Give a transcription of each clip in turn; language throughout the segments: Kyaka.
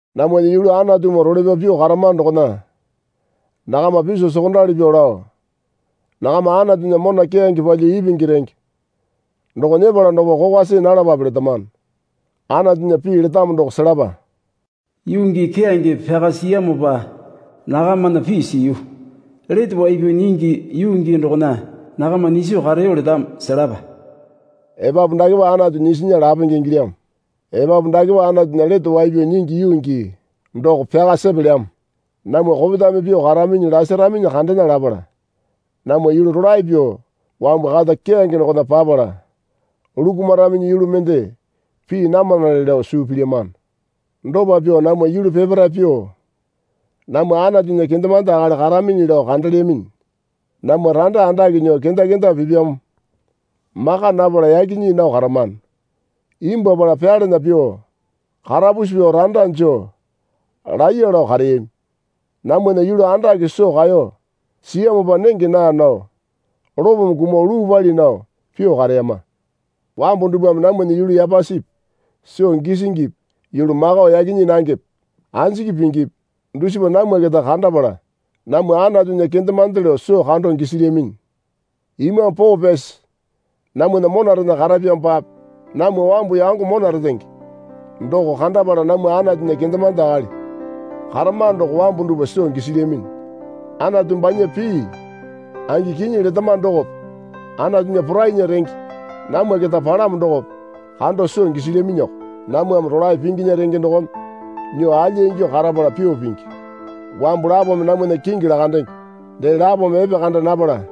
Namwana yulu Anatumoo role pyao pyuo karamano dokona nakama piso sokondali pyuo lao, nakama Anatunya mona keyange palyuo ipingi renge doko nyepala dokopa kokwa see nalapape letamano. Anatunya pii letamo doko selapa. Yuu gii keyange pyaka siyamopa nakamana pii siyu. Lete wai pyao nyingi yuu gii dokona nakama nyiso kareyo letamo. Selapa. Epapu dakepa Anatu nyisinya lapenge ingilyamo. Epapu dakepa Anatunya lete wai pyao nyingi yuu gii doko pyaka sepelyamo. Namwa kopetame pyuo karaminyi lasaraminyi kandena lapala namwa yulu rolae pyuo wambu kata keyange dokona papala lukumaraminyi yulu mende pii namanale lao suu pilyamano. Dopa pyuo namwa yulu peparae pyuo namwa Anatunya kendemande akali karaminyi lao kandelyaminyi. Namwa randa andake nyuo kenda kenda pipyamo maka napala yaki nyii nao karamano. Imbwuapala pyalana pyuo karapusi pyuo randa joo laiya lao kareyami. Namwana yulu andake soo kaeyo siyamopa nenge naa nao lopome kumuo luu pali nao pyuo kareyama. Wambu dupwame namwana yulu yapasipi soo gisingipi yulu makao yaki nyii nangepe anjiki pingipi dusipa namwa keta kandapala namwa Anatunya kendemande lao soo kando gisilyaminyi. Imambu Poo Pyasi namwana monarena karapyamopape namwa wambu yango mona retenge doko kandapala namwa Anatunya kendemande akali karamano doko wambu dupwa soo gisilyaminyi. Anatu banya pii angi kinyi letamano dokope Anatunya porainya renge namwa keta palamo dokope kando soo gisilyaminyiko. Namwame rolae pinginya renge dokome nyuo alya ingyuo karapala pyao pingi. Wambu lapome namwana kingi lakandenge dee lapome epekanda napala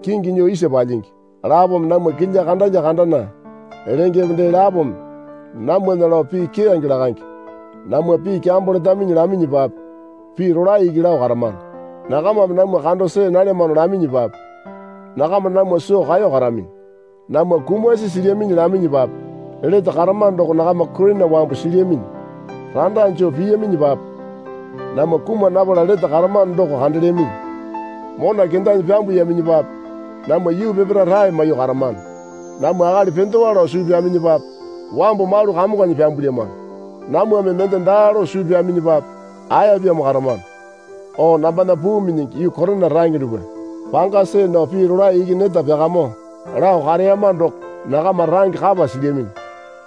kingi nyuo isa palyingi. Lapome namwa kilya kandalya kandana lengepe dee lapome namwana lao pii keyange lakange. Namwa pii kyambo letaminyi laminyipape pii rolae iki lao karamano. Nakamame namwa kando see nalyamano laminyipape nakama namwa soo kaeyo karaminyi. Namwa kumasi silyaminyi laminyipape lete karamano doko nakama Korina wambu silyaminyi. Randa joo piyaminyipape namwa kuma napala lete karamano doko kandelyaminyi. Mona kendanyi pyambuyaminyipape namwa yuu peparae rae maiyuo karamano. Namwa akali pendewa lao suu pyaminyipape wambu malu kamonganyi pyambulyamano. Namwame mende daa lao suu pyaminyipape aepyamo karamano. O nambana puu minyingi yuu Korina range dupwa. Panga see nao pii rolae iki neta pyakamyuo lao kareyama doko nakama range kapa silyaminyi.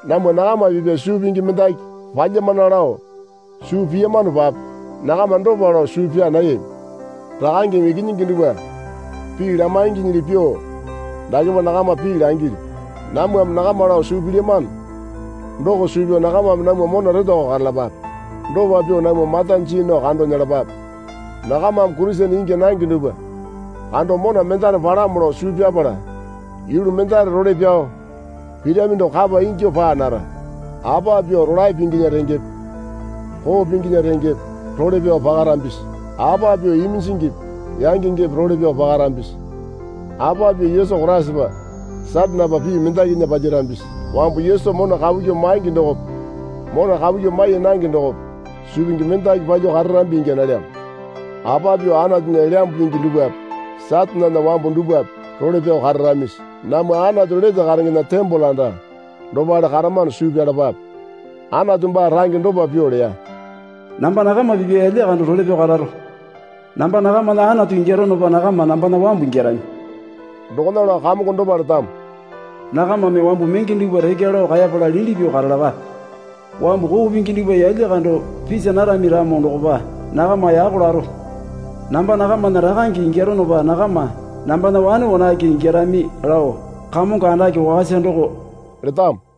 Namwa nakama pipya suu pingi mendaki palyamana lao suu piyamanopape nakama dopa lao suu pyaa nayami. Rakangeme ikinyingi dupwa pii lamainginyili pyuo dakepa nakama pii langilyu. Namwame nakama lao suu pilyamano doko suu pyao nakamame namwa mona retowako karalapape. Dopa pyuo namwa mata jii nao kando nyelapape. Nakamame Kurisene ingya nange dupwa kando mona mendare palamo lao suu pyapala yulu mendare role pyao pirami doko kapa ingyuo paa nara. Apa pyuo rolae pinginya rengepe koo pinginya rengepe role pyao pakarambisi? Apa pyuo iminjingipi yangengepe role pyao pakarambisi? Apa pyuo Yesu Koraisapa Satanepa pii mendakinya palyarambisi? Wambu Yesu mona kapu kyuo maingi dokope mona kapu kyuo mai nange dokope suu pingi mendaki palyuo kararambi ingya nalyamo. Apa pyuo Anatunya Elyambu Pingi dupwape Satanena wambu dupwape role pyao kararamisi? Namwa Anatu lete karengena tembole anda dopale karamano suu pyalapape. Anatu baa range dopa pyuo leya. Namba nakama pipya yalya kando role pyao kararo. Namba nakamana Anatu ingyaronopa nakama nambana wambu ingyarami. Dokona lao Kamongo dopa letamo. Nakamame wambu menge dupwa rekya lao kaepala liti pyuo karalapape. Wambu koo pingi dupwa yalya kando pisa narami ramo dokopa nakama yako laro. Namba nakamana rakange ingyaronopa nakama nambana wane wanake ingyarami lao Kamongo andake wakasa doko letamo.